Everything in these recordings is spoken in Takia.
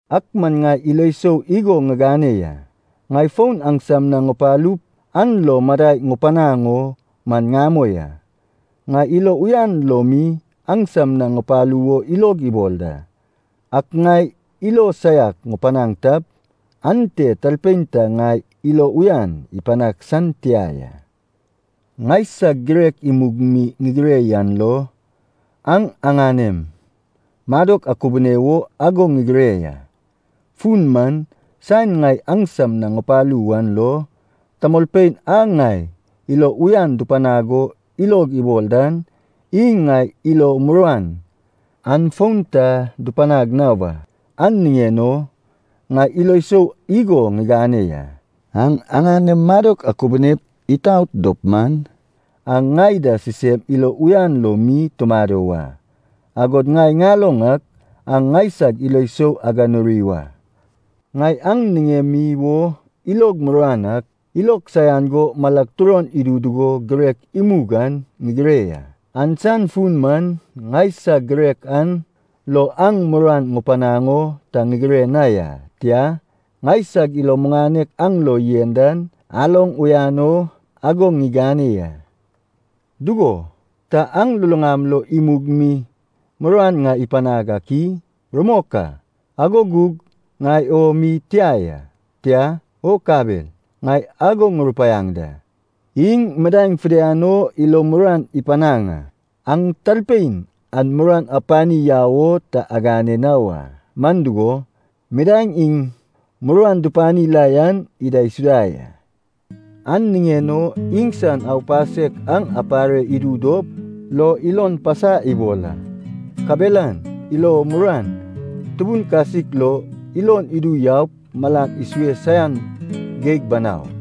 Ak man ŋai ilo sou igo ŋigane ya, ŋai fon aŋsam na ŋupalup an lo madai ŋupanaŋ o man ŋamoi a. Ŋai ilo uyan lo mi aŋsam na ŋupalu wo ilog ibol da. Ak ŋai ilo saiak ŋupanaŋ tap, ante talpein ta ŋai ilo uyan ipanag san tia ya. Ŋaisag girek imug mi ŋigire yan lo, aŋ aŋanem madok akubune wo ago ŋigire ya. Fun man saen ŋai aŋsam na ŋupalu wan lo, tamolpein a ŋai ilo uyan dupanag o ilog ibol dan iŋ ŋai ilo muruan an fon ta dupanag na wa. An niŋen o ŋai ilo sou igo ŋigane ya. Aŋ aŋanem madok akubunep itaot dop man, aŋ ŋai da sisem ilo uyan lo mi tumado wa. Agod ŋai ŋaloŋ ak aŋ ŋaisag ilo sou aganuri wa. Ŋai aŋ niŋemi wo ilog muruan ak, ilog saian go malag turon idu dugo girek imug an ŋigire ya. An san fun man ŋaisag girek an lo aŋ muruan ŋupanaŋ o ta ŋigire na ya. Tia, ŋaisag ilo muŋanek aŋ lo yen dan aloŋ uyan o ago ŋigane ya. Dugo, ta aŋ luluŋam lo imug mi muruan ŋai ipanag ak i? Rumok a, ago gug ŋai o mi tia ya, tia, o kabel, ŋai ago ŋurupaiaŋ da, iŋ midaeŋ fidian o ilo muruan ipanaŋ a. Aŋ talpein an muruan apani yau o ta agane na wa, man dugo, midaeŋ iŋ muruan dupani la yan idaisuda ya. An niŋen o iŋsan aupasek aŋ apare idu dop lo ilon pasa ibol a. Kabelan ilo muruan tubun kasik lo ilon idu yaup malan isue saian geig banau.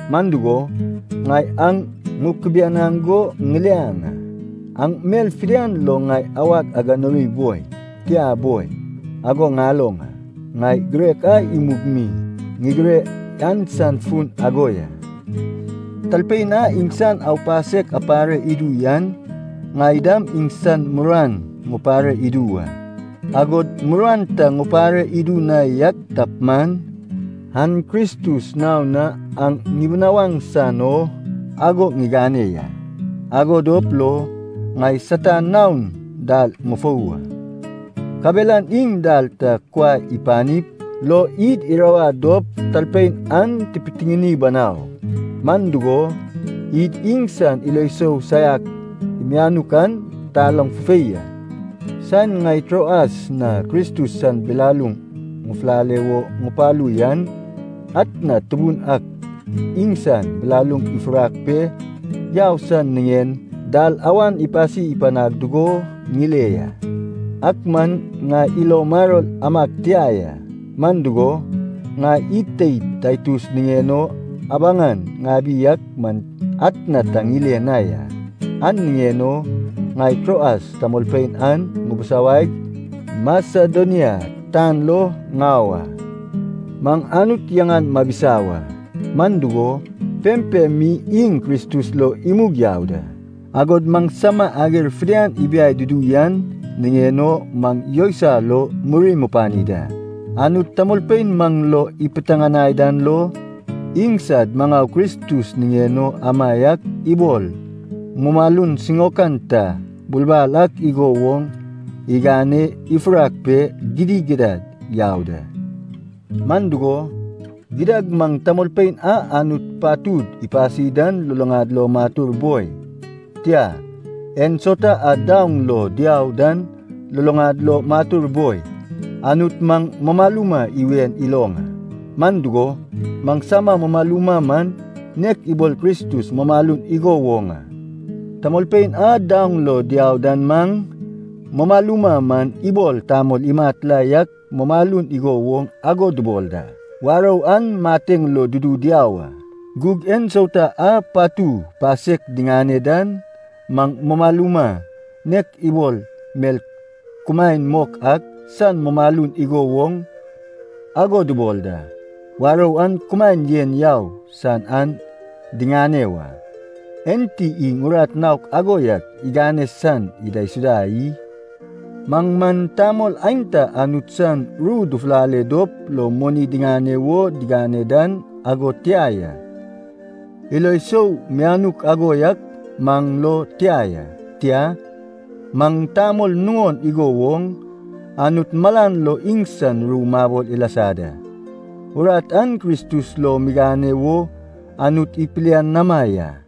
Man dugo, ŋai aŋ ŋukubianaŋ go ŋiliaŋ a, aŋ mel fidian lo ŋai awag aganuri boi, tia boi, ago ŋaloŋ a. Ŋai girek a imug mi ŋigire yan san fun ago ya. Talpein a iŋsan aupasek apare idu yan, ŋai dam iŋsan muruan ŋupare idu wa. Agod muruan ta ŋupare idu na yak tap man, an Kristus naon na aŋ ŋibinawaŋ san o ago ŋigane ya. Ago dop lo ŋai Satan naon dal ŋufou wa, kabelan iŋ dal ta kuai ipanip lo id irawad dop talpein an tipitiŋini banau. Man dugo, id iŋsan ilo sou saiak mianuk an taloŋ fufei a. Saen ŋai Troas na Kristus san bilaluŋ ŋufulale wo ŋupalu yan, atna Tubun ak iŋsan bilaluŋ ifurak pe yau san niŋen dalawan ipasi panag dugo ŋile ya. Ak man ŋai ilo maror amag tia ya. Man dugo, ŋai id teid Taitus niŋen o abaŋan ŋabi ak man atna ta ŋile na ya. An niŋen o ŋai Troas tamolpein an ŋubisawaig Masedonia tan lo ŋau a. Maŋ Anut yaŋan mabisa wa. Man dugo, pempem mi iŋ Kristus lo imug yau da, agod maŋsama ager fidian ibiai dudu yan niŋen o maŋ yousai lo muri mupani da. Anut tamolpein maŋ lo ipiteŋanai dan lo, iŋsad maŋau Kristus niŋen o amaiak ibol mumalun siŋaokan ta bulbal ak igo woŋ igane ifurak pe gidigidad yau da. Man dugo, gidad maŋ tamolpein a Anut patud ipasi dan luluŋad lo matur boi, tia, ensauta a daoŋ lo diau dan luluŋad lo matur boi, Anut maŋ mumaluma iwen iloŋ a, man dugo, maŋsama mumaluma man nek ibol Kristus mumalun igo woŋ a. Tamolpein a daoŋ lo diau dan maŋ mumaluma man ibol tamol imat la yak mumalun igo woŋ ago dubol da. Warou an mateŋ lo dudu diau a. Gug ensauta a patu pasek diŋane dan maŋ mumaluma nek ibol mel kumaen mok ak san mumalun igo woŋ ago dubol da. Warou an kumaen yen yau san an diŋane wa. Enti iŋ urat naok ago yak igane san idaisuda i? Maŋ man tamol aenta Anut san ru dufulale dop lo moni diŋane wo digane dan ago tia ya. Ilo sou mianuk ago yak maŋ lo tia ya. Tia, maŋ tamol nuŋon igo woŋ, Anut malan lo iŋsan ru mabol ilasa da. Urat an Kristus lo migane wo Anut ipilianama ya.